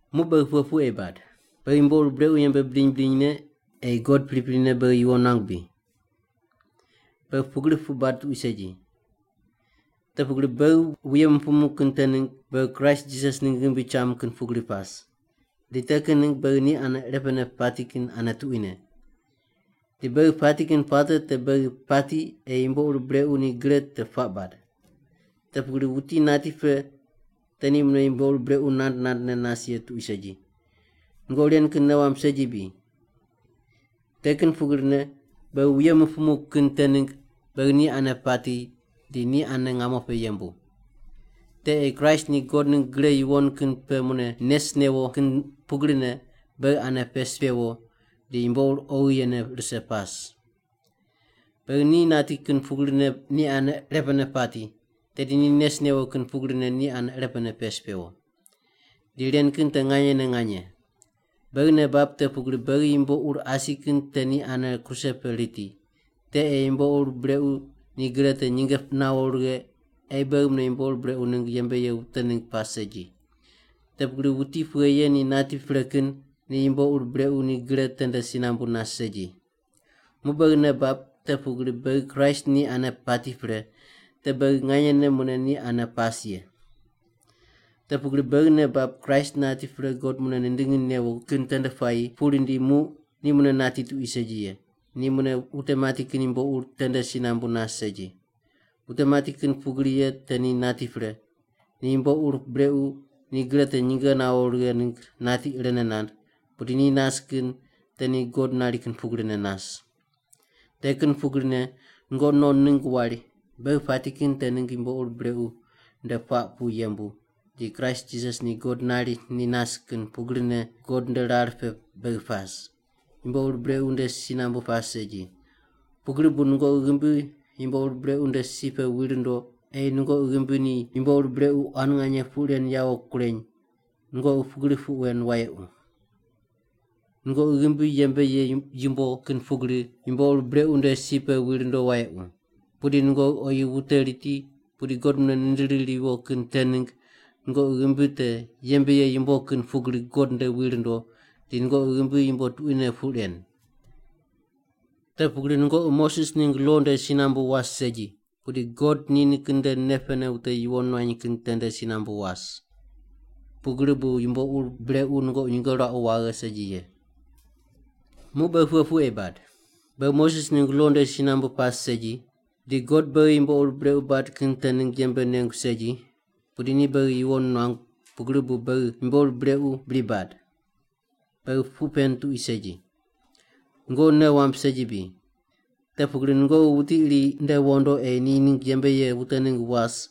Muq beghi pughe puq ei bad? Beghi yumbo ur brequ yembe bidiny bidinyne ei God priprine beghi yuwon nuangu bri? Beghi pugri puq bad tuqui segi! Te pugri beghi wuye mupumu kin te ningg beghi Kraist Jisas ningg ghimbi cham kin pugri pas. Di te kin ningg beghi ni ane irepene pati kin ane tuquine. Di beghi pati kin puate te beghi pati ei yumbo ur brequ ni gre te puaq bad. Te pugri wuti nati pre te ni mune yumbo ur brequ nand nandne nas ye tuqui segi. Nungoqi ren kin nei wamb segi bri? Te kin pugrine beghi wuye mupumu kin te ningg beghi ni ane pati di ni ane ngamo pe yembu. Te ei Kraist ni God ningg gre yuwon kin pe mune nes newo kin pugrine beghi ane pes pewo di yumbo ur oghi yene rise pas. Beghi ni nati kin pugrine ni ane irepene pati, tedi ni nes newo kin pugrine ni ane irepene pes pewo. Di ren kin te nganyene nganye. Beghi nei bab te pugri beghi yumbo ur asi kin te ni ane kruse pe riti, te ei yumbo ur brequ ni gre te nyinge nawo righe ei beghi mune yumbo ur brequ ningg yembe ye wute ningg pas segi. Te pugri wuti pughe ye ni nati pre kin ni yumbo ur brequ ni gre tende si nambu nas segi. Muq beghi nei bab te pugri beghi Kraist ni ane pati pre, te beghi nganyene mune ni ane pas ye. Te pugri beghi nei bab Kraist nati pre God mune nindingi newo kin tende puayi pu rindi muq ni mune nati tuqui segi ye; ni mune wute mati kin yumbo ur tende si nambu nas segi. Wute mati kin pugri ye te ni nati pre, ni yumbo ur brequ ni gre te nyinge nawo righe ningg nati irene nand, pudi ni nas kin te ni God nari kin pugrine nas. Te kin pugrine nungoqi non ningg wari, “Beghi pati kin te ningg yumbo ur brequ nde puaq pu yembu, di Kraist Jisas ni God nari ni nas kin pugrine God nde rar pe beghi pas. Yumbo ur brequ nde si nambu pas segi.” Pugri bu nungoqi ghimbi yumbo ur brequ nde si pe wi rundo ei nungoqi ghimbi ni yumbo ur brequ quan nganye puq ren yawo kureny, nungoqi pugri puq wen wayequ. Nungoqi ghimbi yembe ye yumbo kin pugri yumbo ur brequ nde si pe wi rundo wayequ. Pudi nungoqi oyi wute riti pudi God mune nindiri riwo kin te ningg nungoqi ghimbi te yembe ye yumbo kin pugri God nde wi rundo di nungoqi ghimbi yumbo tuquine puq ren. Te pugri nungoqi Moses ningg lo nde si nambu was segi, pudi God ni nikin nde nei pene wute yuwon nuany kin tende si nambu was. Pugri bu yumbo ur brequ nungoqi nyinge ruaqu waghe segi ye. Muq beghi pughe puq ei bad? Beghi Moses ningg lo nde si nambu pas segi, di God beghi yumbo ur brequ bad kin te ningg yembe nengu segi, pudi ni beghi yuwon nuangu pugri bu beghi yumbo ur brequ bri bad? Beghi puq pen tuqui segi! Nungoqi nei wamb segi bri? Te pugri nungoqi wuti iri nde wondo ei ni ningg yembe ye wute ningg was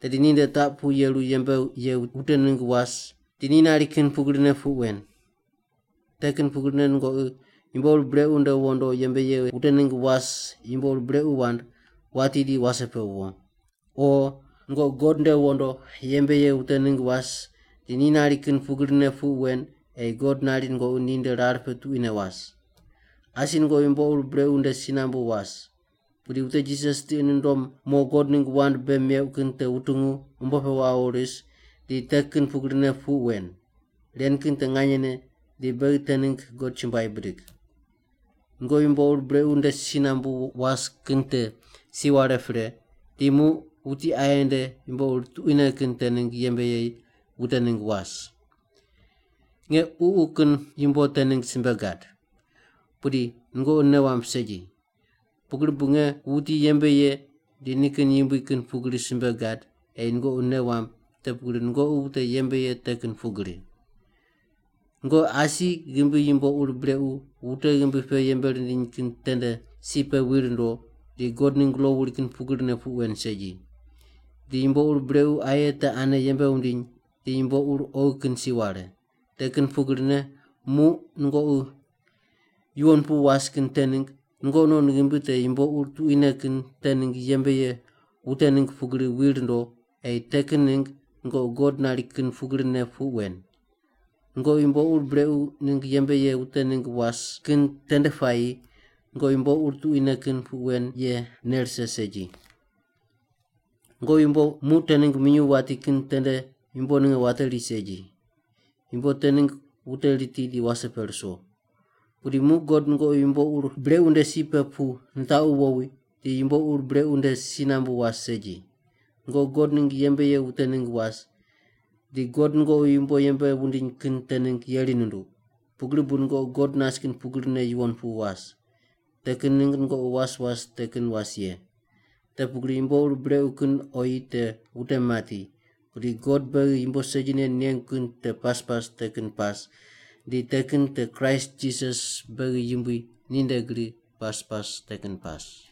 tedi ni nde taq pu yeru yembe ye wute ningg was di ni nari kin pugrine puq wen. Te kin pugrine nungoqi yumbo ur brequ nde wondo yembe ye wute ningg was yumbo ur brequ wand, wati di wase pe wo. O nungoqi God nde wondo yembe ye wute ningg was di ni nari kin pugrine puq wen ei God nari nungoqi ni nde rar pe tuquine was. Asi nungoqi yumbo ur brequ nde si nambu was. Pudi wute Jisas tiqi nundom mo God ningg wand bei meuq kin te wutungu umbo pe wawo ris di te kin pugrine puq wen. Ren kin te nganyene, di beghi te ningg God chumbuai bidig. Nungoqi yumbo ur brequ nde si nambu was kin te si ware pre di muq wuti aye nde yumbo ur tuquine kin te ningg yembe ye wute ningg was. Nge ququ kin yumbo te ningg simbe gad, pudi nungoqi nei wamb segi. Pugri bu nge wuti yembe ye di nikin yumbui kin pugri simbe gad ei nungoqi nei wamb te pugri nungoqi wute yembe ye te kin pugri. Nungoqi asi ghimbi yumbo ur brequ wute ghimbi pe yembe rindiny kin tende si pe wi rundo di God ningg lo wuri kin pugrine puq wen segi. Di yumbo ur brequ aye te ane yembe wundiny di yumbo ur oghi kin si ware. Te kin pugrine muq nungoqi yuwon pu pas kin te ningg nungoqi non ghimbi te yumbo ur tuquine kin te ningg yembe ye wute ningg pugri wi rundo ei te kin ningg nungoqi God nari kin pugrine puq wen. Nungoqi yumbo ur brequ ningg yembe ye wute ningg was kin tende puayi nungoqi yumbo ur tuquine kin puq wen ye nei rise segi. Nungoqi yumbo muq te ningg minyuw wati kin tende yumbo ninge wateri segi. Yumbo te ningg wute riti di wase pe ruso! Pudi muq God nungoqi yumbo ur brequ nde si pe pu nitaqu wowi, di yumbo ur brequ nde si nambu was segi. Nungoqi God ningg yembe ye wute ningg was, di God nungoqi yumbo yembe wundiny kin te ningg yeri nunduq. Pugri bu nungoqi God nas kin pugrine yuwon pu was. Te kin ningg nungoqi was was te kin was ye. Te pugri yumbo ur brequ kin oyi te wute mati, pudi God beghi yumbo segine nengu kin te pas pas te kin pas, di te kin te Kraist Jisas beghi Yumbui ni nde gri pas pas te kin pas.